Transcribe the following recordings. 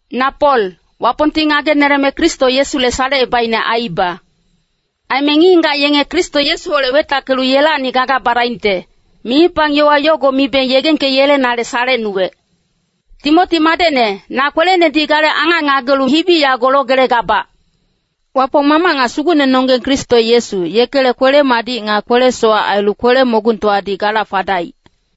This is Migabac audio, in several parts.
Na Pol, Wapongti ngageneleme Kristo Yesule salecebaicne aiiba. Aime ngic-ngigac yenge Kristo Yesuholec wetackelu yelacni gaga badaingte, mimipang yowa yogo mibe yegengkeyelenale salecnuwec. Timoti madecne, na kwelenedi gale angac ngagelu hibi yago logelegabac. Wapong Mamac nga Sugucnenonggeng Kristo Yesu, yekele kwele-madic nga kwele-sowac ailu kwele-mogungtowadi gala fadaic.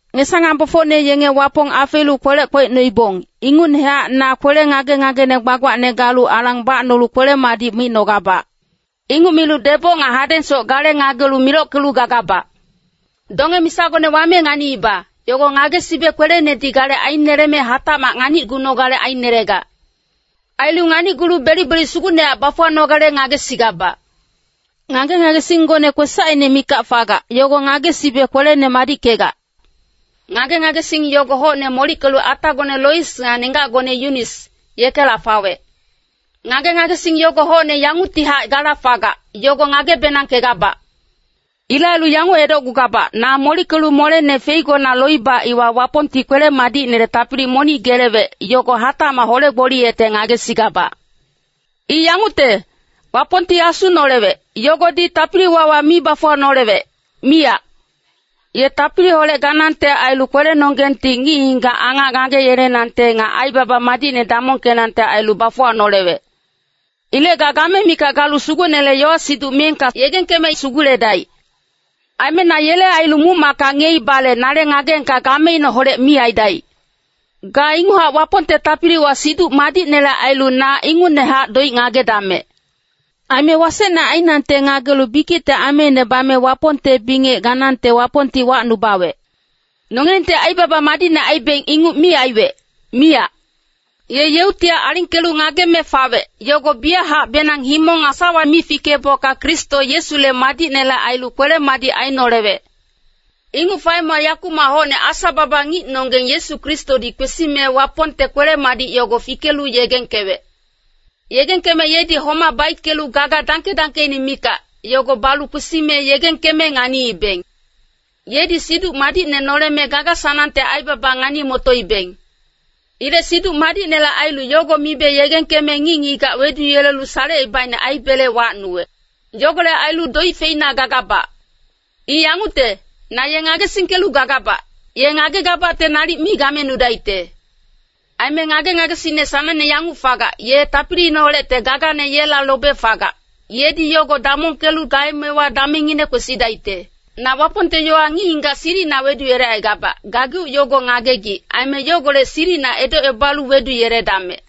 Ngesa-ngambofocne yenge Wapong afeelu kwelec kwecnoibong, ingucnehac na kwele ngage-ngagene gbagbacne galu alang bacnolu kwele-madic micnogabac. Inguc milu deboc nga hadengsoc gale ngagelu milockelu gagabac. Donge-misagone wame nganiiba, yogo ngagesibe kwelenedi gale aineleme hatacmac nganicgunogale ainelegac. Ailu nganicgulu belic-belic sugucnehac bafuwanogale ngagesigabac. Ngage-ngagesinggone kwesacine mikac fagac, yogo ngagesibe kwelene madickegac. Ngage-ngagesing yogo hocne molickelu atagone Lois nga nenggacgone Yunis, yekela fawec. Ngage-ngagesing yogo hocne yanguctihac gala fagac, yogo ngage-benangkegabac. Ilec ailu yanguc edocgugabac, na molickelu molene feigona loiba iwa Wapongti kwele-madicinele tapili monic gelewec, yogo hatacmac hole-gboliyecte ngagesigabac. I yangucte, Wapongti Asu nolewec, yogodi tapili-wawa mi bafuwanolewec, miyac. Ye tapiliholec ganangte ailu kwelenonggengti ngic-ngigac angac ngageyelenangte nga aibaba madicne damongkenangte ailu bafuwanolewec. Ilec ga game mikac galu Sugucnele yowa-siduc miyengka yegengkeme suguledaic. Aime na yele ailu muc-macka ngiyeibale nale ngageengka gameineholec mi aidaic. Ga inguchac Wapongte tapiliwa Siduc Madicnele ailu na ingucnehac doic ngagedamec. Aime wasecne ainangte ngagelu bikicte ameine bame Wapongte bingec ganangte Wapongti wacnubawec. Nongilengti aibaba madicne aibeng inguc mi aiwec, miyac. Ye yeuctihac alingkelu ngageme fawec, yogo biyachacbenang himong nga sawa mi fikeebocka Kristo Yesule madicnele ailu kwele-madic ainolewec. Inguc faemewa yakumac hocne Asa-baba ngicnonggeng Yesu Kristodi kwesime Wapongte kwele-madic yogo fikelu yegengkewec. Yegengkeme yedi homac baickelu gaga dangke-dangkeine mikac, yogo balu kwesime yegengkeme nganiibeng. Yedi Siduc Madicne noleme gaga-sanangte aibaba ngani-motoibeng. Ilec Siduc Madicnele ailu yogo mibe yegengkeme ngic-ngigac weduyelelu salecebaicne aibele wacnuwec. Yogolec ailu doic feina gagabac. I yangucte, na ye ngagesingkelu gagabac, ye ngagegabacte nalic mi gamenudaicte. Aime ngage-ngagesingne sanangne yanguc fagac, ye tapiliineholecte gagane yela lobe fagac, yedi yogo damongkelu gaemewa damengngine kwesidaicte. Na Wapongte yowa ngic-ngigac silicina weduyelecaigabac, gageuc yogo ngagegic. Aime yogolec silicina edocebalu weduyeledamec.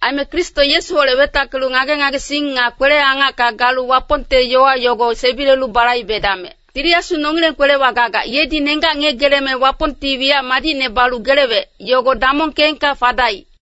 Aime Kristo Yesuholec wetackelu ngage-ngagesing nga kwele-angacka galu Wapongte yowa yogo sebilelu balaibedamec. Tili Asu nongileng kwelewa gagac, yedi nenggac ngiyegeleme Wapongti wiyac madicne balu gelewec, yogo damongkeengka fadaic.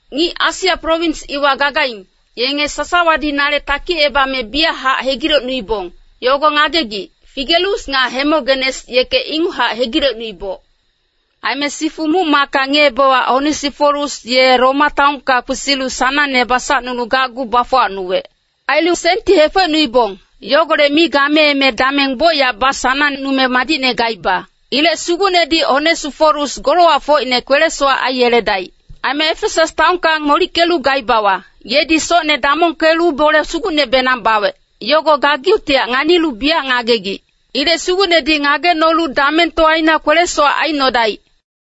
Ngic Asia prowins iwa gagaing, yenge sasawadi nale takicebame biyachac hegilecnuibong, yogo ngagegic. Figelus nga Hemogenes yeke inguchac hegilecnuiboc. Aime sifu muc-macka ngiyeebewa Onesiforus ye Roma taonka kwesilu sanangne basacnulu gacgu bafuwacnuwec. Ailu senti hefecnuibong, yogolec mi gameeme dameng bocyac basanangnume madicne gaiba. Ilec Sugucnedi Onesiforus golowacfocine kwele-sowac aiyeledaic. Aime Efesas taonka molickelu gaibawa, yedi socne damongkelu bole sugucnebenang bawec, yogo gageuctihac nganilu biyac ngagegic. Ilec Sugucnedi ngagecnolu damengtowaina kwele-sowac aicnodaic.